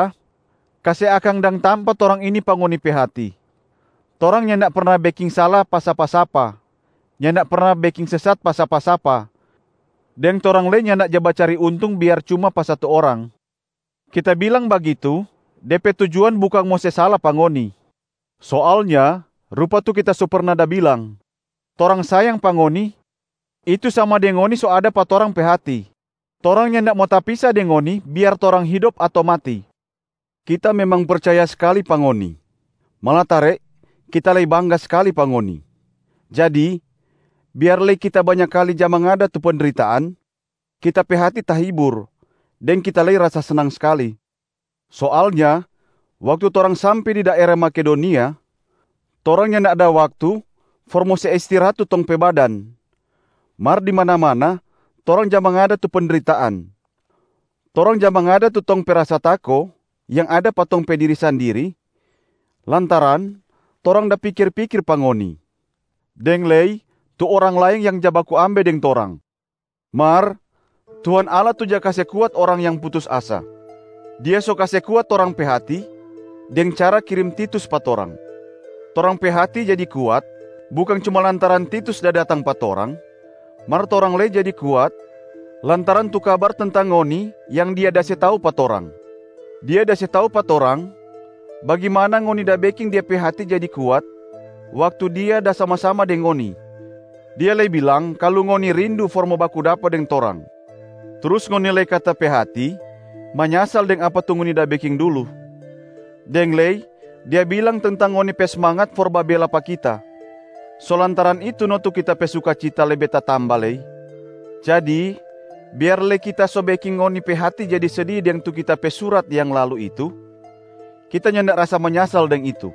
Sudara-sudara, kase akang dang tampa torang ini pa ngoni pe hati. Torang nyanda perna beking sala pa sapa-sapa, nyanda perna beking sesat pa sapa-sapa, deng torang lei nyanda ja bacari untung biar cuma pa satu orang. Kita bilang bagitu, de pe tujuan bukang mo se sala pa ngoni. Soalnya rupa tu kita so perna da bilang, torang sayang pa ngoni, itu sama deng ngoni so ada pa torang pe hati. Torang nyanda mo tapisa deng ngoni biar torang hidop ato mati. Kita memang percaya skali pa ngoni, malatare kita lei bangga skali pa ngoni. Jadi biar lei kita banya kali ja mangada tu pendritaan, kita pe hati tahibur deng kita lei rasa snang skali. Soalnya waktu torang sampe di daera Makedonia, torang nyanda ada waktu for mo se istirahat tu tong pe badan, mar di mana-mana torang ja mangada tu pendritaan. Torang ja mangada tu tong pe rasa tako yang ada pa tong pe diri sandiri lantaran torang da pikir-pikir pa ngoni, deng lei tu orang laeng yang ja baku ambe deng torang. Mar Tuhan Allah tu ja kase kuat orang yang putus asa. Dia so kase kuat torang pe hati deng cara kirim Titus pa torang. Torang pe hati jadi kuat bukang cuma lantaran Titus da datang pa torang, mar torang lei jadi kuat lantaran tu kabar tentang ngoni yang dia da se tau pa torang. Dia da se tau pa torang bagimana ngoni da beking dia pe hati jadi kuat waktu dia da sama-sama deng ngoni, dia lei bilang kalu ngoni rindu for mo baku dapa deng torang. Trus ngoni lei kata pe hati manyasal deng apa tu ngoni da beking dulu, deng lei dia bilang tentang ngoni pe smangat for babela pa kita. So lantaran itu no tu kita pe sukacita lebe tatamba lei. Jadi biar lei kita so beking ngoni pe hati jadi sedi deng tu kita pe surat yang lalu itu, kita nyanda rasa manyasal deng itu.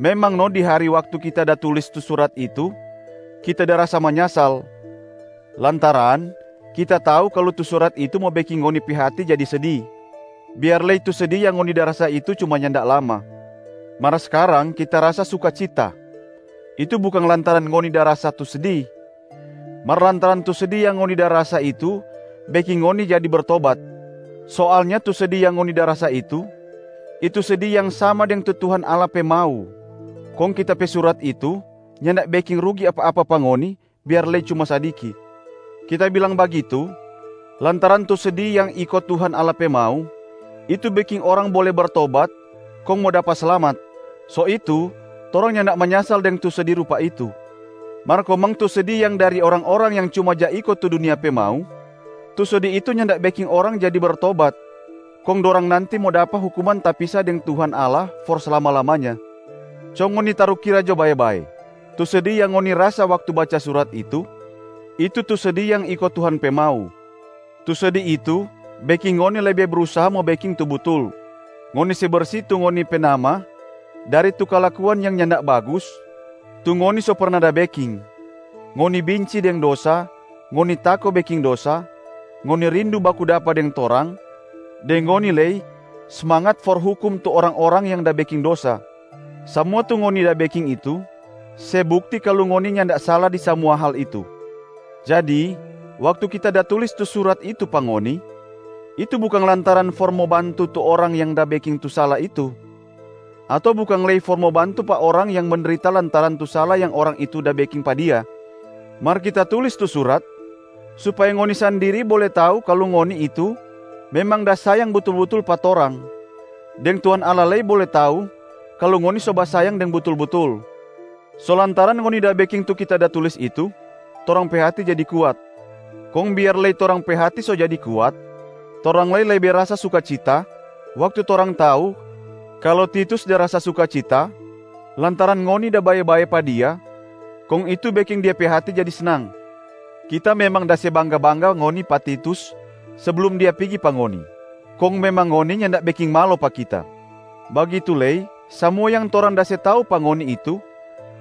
Memang no di hari waktu kita da tulis tu surat itu kita da rasa manyasal, lantaran kita tau kalu tu surat itu mo beking ngoni pe hati jadi sedi, biar lei tu sedi yang ngoni da rasa itu cuma nyanda lama. Mar skarang kita rasa sukacita, itu bukang lantaran ngoni da rasa tu sedi, mar lantaran tu sedi yang ngoni da rasa itu beking ngoni jadi bertobat. Soalnya tu sedi yang ngoni da rasa itu, itu sedi yang sama deng tu Tuhan Allah pe mau, kong kita pe surat itu nyanda beking rugi apa-apa pa ngoni, biar lei cuma sadiki. Kita bilang bagitu lantaran tu sedi yang iko Tuhan Allah pe mau, itu beking orang bole bertobat kong mo dapa slamat, so itu torang nyanda manyasal deng tu sedi rupa itu. Mar komang tu sedi yang dari orang-orang yang cuma ja iko tu dunia pe mau, tu sedi itu nyanda beking orang jadi bertobat kong dorang nanti mo dapa hukuman tapisa deng Tuhan Allah for slama-lamanya. Co ngoni tarukira jo bae-bae, tu sedi yang ngoni rasa waktu baca surat itu, itu tu sedi yang iko Tuhan pe mau. Tu sedi itu beking ngoni lebe brusaha mo beking tu butul, ngoni se bersi tu ngoni pe nama dari tu kalakuan yang nyanda bagus tu ngoni so perna da beking, ngoni binci deng dosa, ngoni tako beking dosa, ngoni rindu baku dapa deng torang, deng ngoni lei smangat for hukum tu orang-orang yang da beking dosa. Samua tu ngoni da beking itu se bukti kalu ngoni nyanda sala di samua hal itu. Jadi waktu kita da tulis tu surat itu pa ngoni, itu bukang lantaran for mo bantu tu orang yang da beking tu sala itu, ato bukang lei for mo bantu pa orang yang mendrita lantaran tu sala yang orang itu da beking pa dia. Mar kita tulis tu surat supaya ngoni sandiri bole tau kalu ngoni itu memang da sayang butul-butul pa torang, deng Tuhan Allah lei bole tau kalu ngoni so basayang deng butul-butul. So lantaran ngoni da beking tu kita da tulis itu, torang pe hati jadi kuat. Kong biar lei torang pe hati so jadi kuat, torang lei lebe rasa sukacita waktu torang tau kalu Titus da rasa sukacita lantaran ngoni da bae-bae pa dia kong itu beking dia pe hati jadi snang. Kita memang da se bangga-bangga ngoni pa Titus seblum dia pigi pa ngoni, kong memang ngoni nyanda beking malo pa kita. Bagitu lei samua yang torang da se tau pa ngoni itu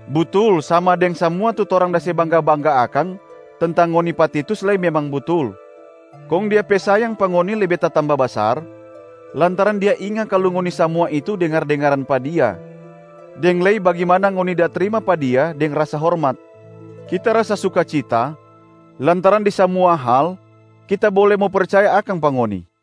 butul sama deng samua tu torang da se bangga-bangga akang tentang ngoni pa Titus lei memang butul. Kong dia pe sayang pa ngoni lebe tatamba basar, lantaran dia inga kalu ngoni samua itu dengar-dengaran pa dia, deng lei bagimana ngoni da trima pa dia deng rasa hormat. Kita rasa sukacita lantaran di samua hal kita bole mo percaya akang pa ngoni.